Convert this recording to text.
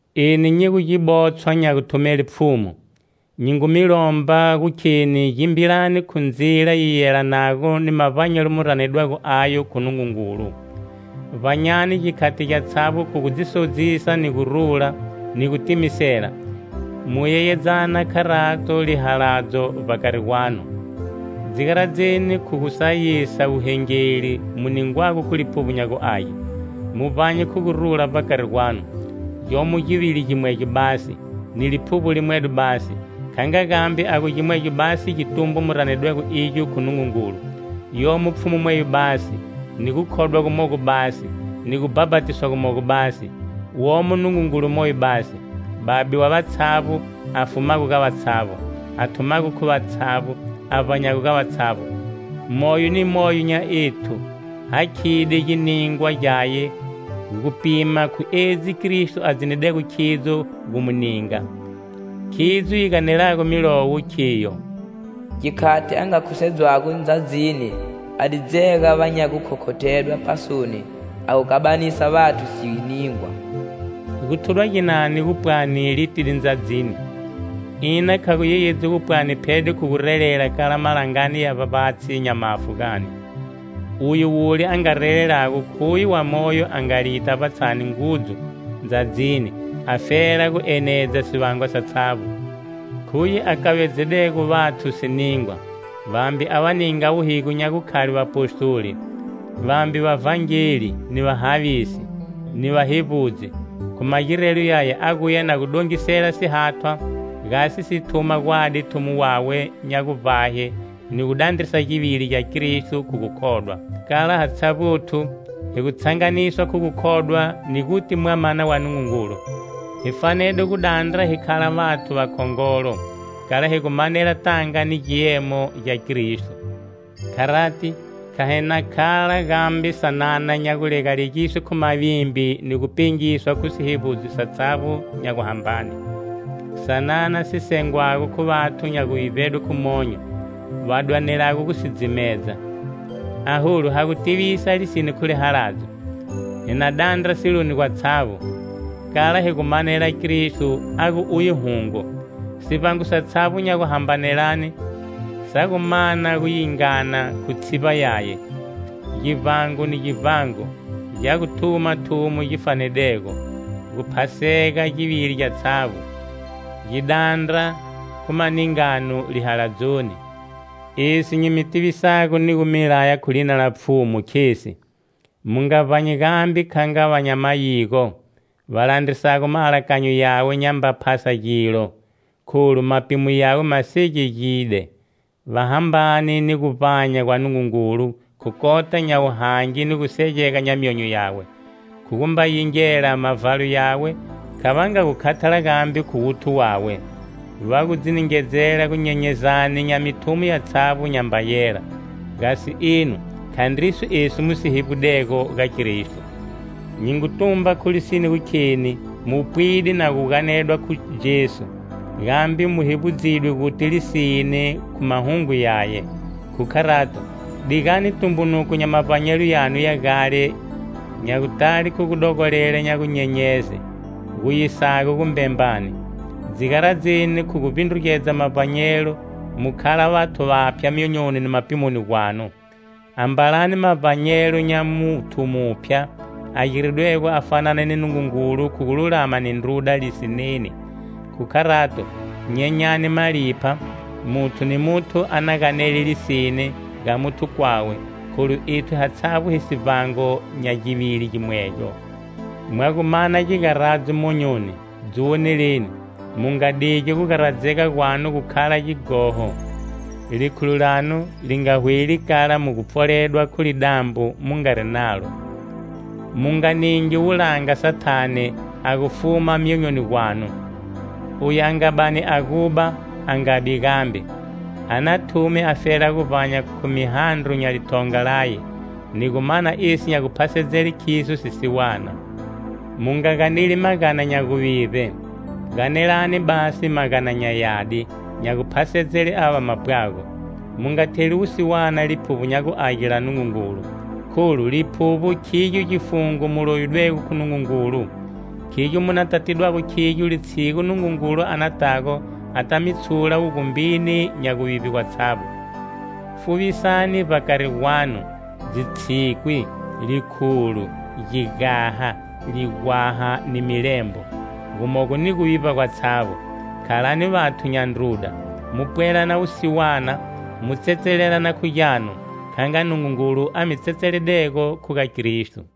Eni nyi gu gibotshwa nya guthumele Pfhumu, nyi ngu mi lomba gu kheni gimbilani khu ndzila yi yelanago ni mavbanyelo mu ranedwego ayo khu Nungungulu. Vbanyani gikhati gyatshavbo khu gu dzi sodzisa ni gurula, ni gutimisela. Mu yeyedzana, kharato, lihaladzo vbakari gwanu. Dzi garadzeni khu gu sayisa wuhengeli mu ningwago khu Liphuvbo nya gu Age, mu vbanye khu gurula vbakari gwanu. Gyomo givili gimwegyo basi, ni Liphuvbo limwedo basi, kha nga gambe a gu gimwegyo basi gitumbo mu ranedwego igyo khu Nungungulu. Yomo Pfhumu mweyo basi, ni gukhodwa gumogo basi, ni gubhapatiswa gumogo basi: womo Nungungulu moyo basi, Babe wa vatshavbo, a fumago ga vatshavbo, a thumago khu vatshavbo, a vbanyago ga vatshavbo. Moyo ni moyo nya ethu hakhide giningwa gyaye gupima khu edzi Kristo a dzinidego khidzo gu mu ninga. Khidzo yi ganelago Milowo khiyo: "Gikhati a nga khusedzedwa ndzadzini a di dzega va nya gukhothedwa pasoni a gu kabanisela vathu siningwa." Gu thudwa ginani gupwani "litide ndzadzini"? Ina kha gu yayedzi gupwani phede khu gu relela kala malangani ya vbavbatshi nya mafu gani? Uye wule a nga relelago, khuye wamoyo a nga lita vbatshani ngudzu, ndzadzini, afela gu enedza sivangwa satshavbo. Khuye a kavedzedego vathu siningwa: vambe a va ninga wuhigo nya gukhale vapostoli, vambe vavhangeli, ni vahavisi, ni vahevbudzi. Khu magirelo yaya, a guya na gu dongisela sihathwa gasi si thuma gwadi thumo wawe nya guvbahe ni gu dandrisa givili gya Kristo khu gukhodwa, kala hatshavbothu hi gu tshanganiswa khu gukhodwa ni guti Mwamana wa Nungungulu. Hi fanede gu dandra hi khala vathu vakhongolo, kala hi gu manela tanga ni giemo gya Kristo. Kharati, kha hi na khala gambe sanana nya gulegalegiswe khu mavimbi ni gu pengiswa khu sihevbudzo satshavbo nya guhambane, sanana si sengwago khu vathu nya guvivbedwe khu monyo, va dwanelago gu si dzimedza. Aholu ha gu tivisa lisine khu lihaladzo, hi na dandra siloni gwatshavbo, kala hi gu manela Kristo a gu uye hungo. Sivbango satshavbo nya guhambanelane sa gu mana gu yingana khu tshivba yaye. Givbango ni givbango gya gu thuma thumo gi fanedego, guphasega givili gyatshavbo, gi dandra khu maningano lihaladzoni. Esi nyi mi tivisago ni gu mi laya khu lina la Pfhumu, khesi: mu nga vbanyi gambe kha nga va nya mayigo va landrisago maalakanyo yawe nyamba phasa gilo, kholu mapimo yawe ma segegide. Va hambane ni guvbanya gwa Nungungulu khu kota nya wuhangi ni gusegega nya myonyo yawe. Khu gumba yingela mavhalo yawe, kha va nga gu khathala gambe khu wuthu wawe. Va gu dzi ningedzela gunyenyezani nya mithumo yatshavbo nyamba yela. Gasi enu, khandriso esi mu si hevbudego ga Kristo. Nyi ngu tumba khu lisine gu kheni mu pwide na gu ganedwa khu Jesu, gambe mu hevbudzidwe guti lisine khu mahungu yaye. Khu kharato, digani tumbunuko nya mavbanyelo yanu ya gale nya gutale khu gudogolela nya gunyenyeze, gu yisago gumbembani. Dzi garadzeni khu gu vbindrugedza mavbanyelo mu khala vathu vaphya myonyoni ni mapimoni gwanu. Ambalani mavbanyelo nya muthu muphya a giridwego a fanana ni Nungungulu khu gululama ni ndruda lisineni. Khu kharato, nyenyani malipha; muthu ni muthu a na ganele lisine ga muthu kwawe, kholu ethu hatshavbo hi sivbango nya givili gimwegyo. Mwa gu mana gigaradzo monyoni,dzi woneleni, mu nga digi gugaradzega gwanu gu khala gighoho. Likhulo lanu li nga hweli kala mu gu pfoledwa khu lidambo mu ngari nalo. Mu nga ningi wulanga Sathane a gu fuma myonyoni gwanu. Oyu a nga bani a guba, a ngabi gambe, a na thume afela guvbanya khu mihandro nya lithonga laye, ni gu mana esi nya guphasedzele khiso sisiwana. Mu nga ganeli magana nya guvivbe, ganelani basi magana nya yadi, nya guphasedzele ava va mapwago. Mu nga theli wusiwana Liphuvbo nya gu Age la Nungungulu, kholu Liphuvbo khigyo gifungo mu lovidwego khu Nungungulu. Khigyo mu nata tidwago khigyo litshigu Nungungulu anatago ata mi tshula wugumbini nya guvivbe gwatshavbo. Fuvisani vbakari gwanu dzitshikwi, likhulo, gigaha, ligwaha ni milembo, gumogo ni guvivba gwatshavbo. Khalani vathu nya ndruda, mu pwelana wusiwana, mu tsetselelana khu gyanu, kha nga Nungungulu a mi tsetseledego khu ga Kristo.